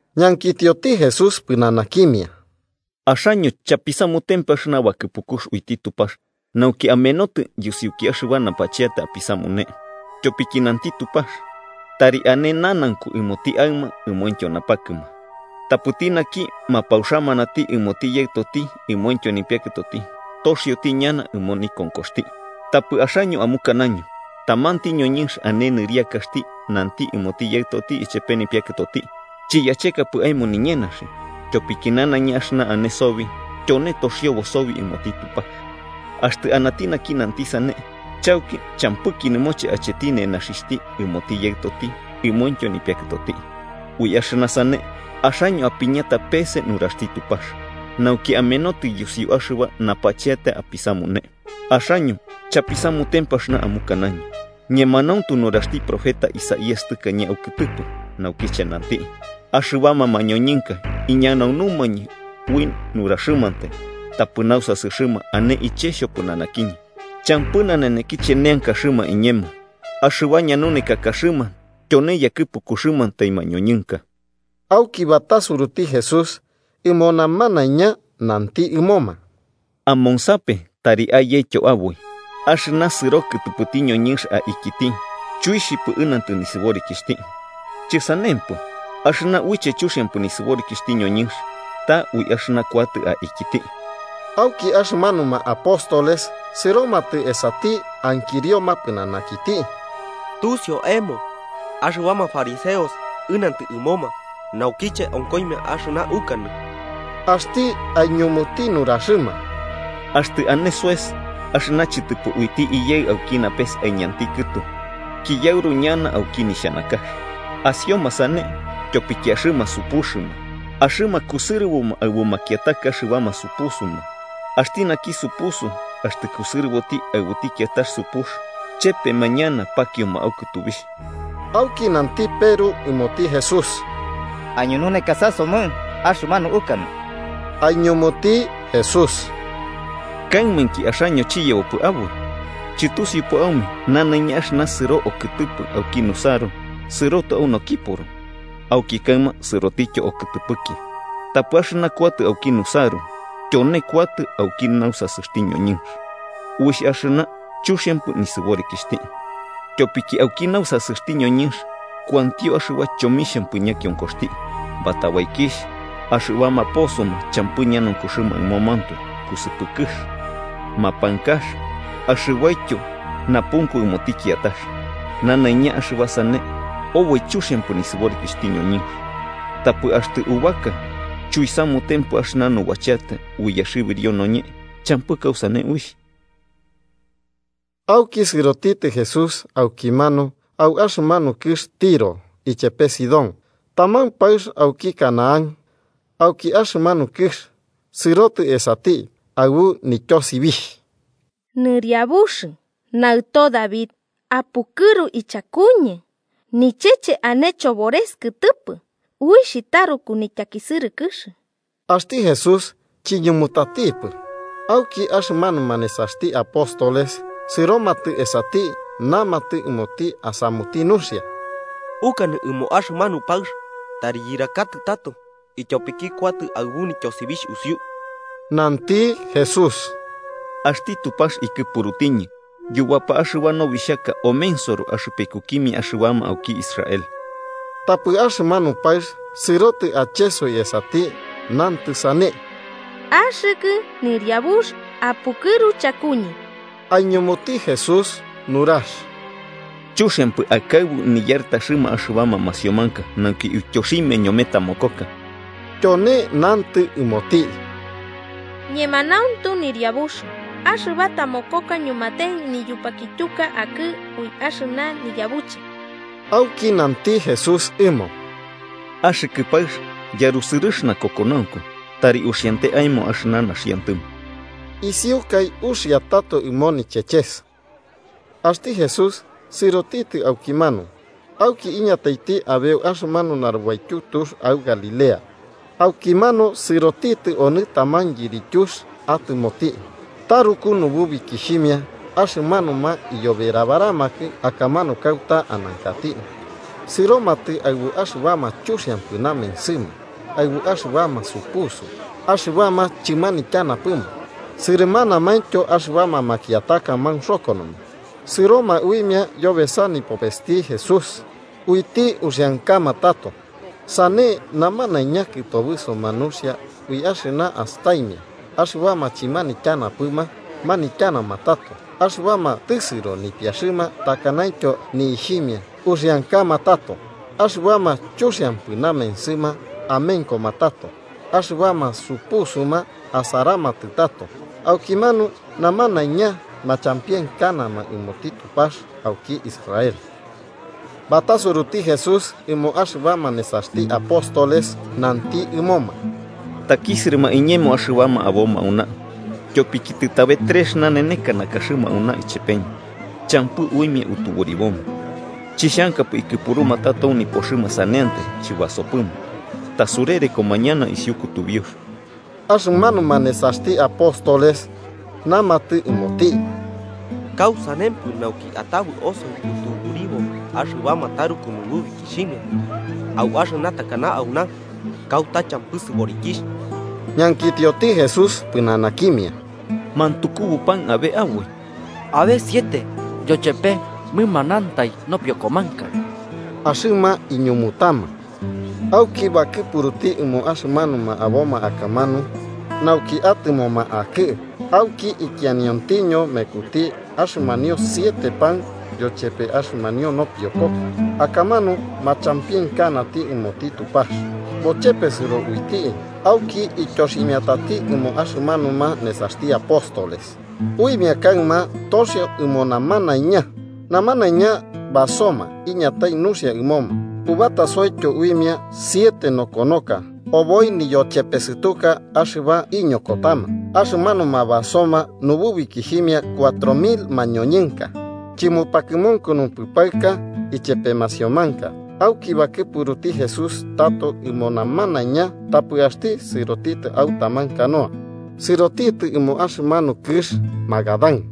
Ñankitioti Jesús pɨnanakimia: –¿Axaño chapisamutempɨ axɨna bakɨpukux uiti Tupax nauki amenotɨ yusiuki axɨba napacheata apisamune? Tyopiki nanti Tupax: ‘Tari ane nanaunku ɨmoti aɨma ɨmointyo napakɨma’, ‘tapɨti Naki mapauxamanati ɨmoti yaɨtoti ɨmointyo nipiakɨtoti toxioti ñana ɨmo nikonkoxti.’ Tapɨ axaño amukanaño tamanti ñoñɨnx ane nɨriakaxti nanti ɨmoti yaɨtoti ichepe nipiakɨtoti: ‘Chiyachekapɨ aemo niñenaxi, tyopiki nanaiña axɨna ane sobi tyone toxiobo sobi ɨmoti Tupax.’ Axtɨ anati naki nanti sane, chauki champɨki nɨmoche acheti nenaxixhti ɨmoti yaɨtoti ɨmointyo nipiakɨtoti. Ui axɨna sane, axaño apiñata peese nuraxti Tupax nauki amenotɨ yusiu axɨba napacheata apisamune. ¡Axaño chapisamutempɨ axɨna amukanaño! Ñemanauntu nuraxti profeta Isaías tɨkañe aukɨtɨpɨ, naukiche nanti: ‘Axɨbama mañoñɨnka iñanaunumañɨ ui naruxɨmantai, tapɨ nausasɨxɨma ane iche xhopɨnanakiñɨ. Champɨ nanenekiche neankaxɨma iñemo. Axɨba ñanunekakaxɨma tyone yakɨpukuxɨmantai mañoñɨnka.’ Auki batasuruti Jesús ɨmo namanaiña nanti ɨmoma: –Amonsape tari ayetyo aboi: Axɨna sɨro kɨtɨpɨti ñoñɨnx aikiti chuixhipɨ ɨnantɨ nisɨborikixhti. Chɨsanempɨ, axɨna uiche chuxiampɨ nisɨborikixhti ñoñɨnx ta ui axɨna kuatɨ aikiti. Auki axɨmanuma apóstoles sɨromatɨ esati ankirioma pɨnanakiti: –¿Tusiu aemo axɨbama fariseos ɨnantɨ ɨmoma naukiche onkoimia axɨna ukanɨ? Axti aiñumuti nuraxɨma: –Axtɨ ane soes axɨna chɨtɨpɨ uiti Iyaɨ auki napes aiñanti kɨtu, kiyauru ñana auki nixhanakax. Asioma sane, tyopiki axɨma supuxɨma, axɨma kusɨrɨboma aɨbu makiataka axɨbama supusuma. Axti naki supusu axtɨ kusɨrɨboti aɨbuti kiatax supux, chepema ñana pakioma au kɨtubixh. Auki nanti Peru ɨmoti Jesús: –Aiñunekasasomɨ axɨmanu ukanɨ. Aiñumuti Jesús: –¿Kaimainki axaño chiyebopɨ aboi? ¿Chɨtusiupɨ aume nanaiña axɨna sɨro okɨtɨpɨ auki nusaru sɨrotɨ au nokiporo, auki kaɨma sɨrotityo okɨtɨpɨki? Tapɨ axɨna kuatɨ auki nusaru tyone kuatɨ auki nausasɨxti ñoñɨnx. Uixh axɨna chuxiampɨ nisɨborikixhti. Tyopiki auki nausasɨxti ñoñɨnx kuantio axɨba chomixhampɨ ñakionkoxti, batabaikixh, axɨbama posoma champɨ ñanaunkuxɨma ɨmomantoe, kusɨpɨkɨx, mapankax axɨbaityo napunku ɨmoti kiatax. Nanaiña axɨba sane, oboi chuxiampɨ nisɨborikixhti ñoñɨnx. Tapɨ axtɨ ubaka chuisamutempɨ axɨna nubacheata uiyaxɨbirio noñe, champɨ kausane uixh. Auki sɨrotitɨ Jesús aukimanu au axɨmanu kɨx Tiro ichepe Sidón. Taman paɨx auki Canaán, auki axɨmanu kɨx, sɨrotɨ esati, aɨbu nityosibixh: –¡Nɨriabux, Naɨto David, apukɨru ichakuñɨ! ¡Nicheche ane chobores kɨtɨpɨ uixh taruku nityakisɨrɨkɨx! Axti Jesús chiñumutatipɨ. Auki axɨmanuma nesaxti apóstoles sɨromatɨ esati namatɨ ɨmoti asamuti nuxia: –Ukanɨ ɨmo axɨmanu paɨx tari yɨrakatɨ tato, ityopiki kuatɨ aɨbu nityosibixh usiu. Nanti Jesús: –Axti Tupax ikɨpurutiñɨ yubapa axɨba nobixhaka omensoro axɨpekukimia axɨbama auki Israel. Tapɨ axɨmanu paɨx sɨrotɨ achesoi esati, nantɨ sane: –¡Axɨkɨ Yɨriabux, apukɨru chakuñɨ! Aiñumuti Jesús nurax: –Chuxiampɨ akaɨbu niyartaxɨma axɨbama masiomanka nauki uityoximia ñome tamokoka. Tyone nantɨ ɨmoti: –Ñemanauntu, Yɨriabux. Axɨba tamokoka ñumate niyupakityuka akɨ ui axɨna niyabuche. Auki nanti Jesús ɨmo: –¡Axɨkɨ paɨx, yarusɨrɨx nakokonaunku! Tari uxiante aemo axɨna naxiantɨmo. Isiukai uxia tato ɨmo nicheches. Axti Jesús sɨrotitɨ aukimanu, auki iñataiti abeu axɨmanu narubaityu tux au Galilea. Aukimanu sɨrotitɨ onɨ taman yirityux atɨmoti. Taruku nububikixhimia axɨmanuma iyoberabaramakɨ akamanu kauta anankati. Sɨromatɨ aɨbu axɨbama chuxiampɨ namensɨma, aɨbu axɨbama supusu, axɨbama chɨmanityapɨma sɨrɨmanaintyo axɨbama makiataka maunxokonoma, sɨroma uimia yobesa nipopesti Jesús, uiti uxiankama tato. Sane namanaiña kɨtobɨsoma nuxia ui axɨna astaimia axɨbama chɨmanityanapɨma manityanama tato, axɨbama tɨsɨro nipiaxɨma takanaityo ni'ixhimia uxiankama tato, axɨbama chuxiampɨ namensɨma amenkoma tato, axɨbama supusuma asaramatɨ tato. Aukimanu namanaiña machampienkanama ɨmoti Tupax auki Israel. Batasuruti Jesús ɨmo axɨbama nesaxti apóstoles, nanti ɨmoma: –Takisɨrɨma iñemo axɨbama aboma auna, tyopiki tɨtabe trex naneneka nakaxɨma auna ichepeñɨ champɨ uimia utuburiboma. Chixhankapɨ ikɨpuruma tato au nipoxɨma saneantai chibasopɨma, tasurerekoma ñana isiu kutubiux. Axɨmanuma nesaxti apóstoles namatɨ ɨmoti: –¿Kausanempɨ nauki atabɨ osoi utuburibo axɨbama taruku nububikixhimia, au axɨna takana auna, kauta champɨ sɨborikixh? Ñankitioti Jesús pɨnanakimia: –¿Mantukubu pan abe aboi? –Abe siete, yochepe mɨmanantai nopiokomanka–axɨma iñumutama. Auki bakɨpuruti ɨmo axɨmanuma aboma akamanu nauki atɨmoma akɨ, auki ikianiontiño mekuti axɨmanio siete pan yochepe axɨmanio nopiokoka, akamanu machampienkanati ɨmoti Tupax, bochepesɨro uiti auki ityoximiatati ɨmoma axɨmanuma nesaxti apóstoles, uimia kaɨma toxio ɨmo namanaiña. Namanaiña basoma iñatai nuxia ɨmoma, ubatosoityo uimia siete nokonoka obi niyochepesɨtuka axɨba iñokotama. Axɨmanuma basoma nububikixhimia cuatro mil mañoñɨnka, chɨmupakɨmunkunupɨ paɨka ichepe masiomanka. Auki bakɨpuruti Jesús tato ɨmo namanaiña, tapɨ axti sɨroti au taman canoa sɨrotitɨ ɨmo axɨmanu kɨx Magadán.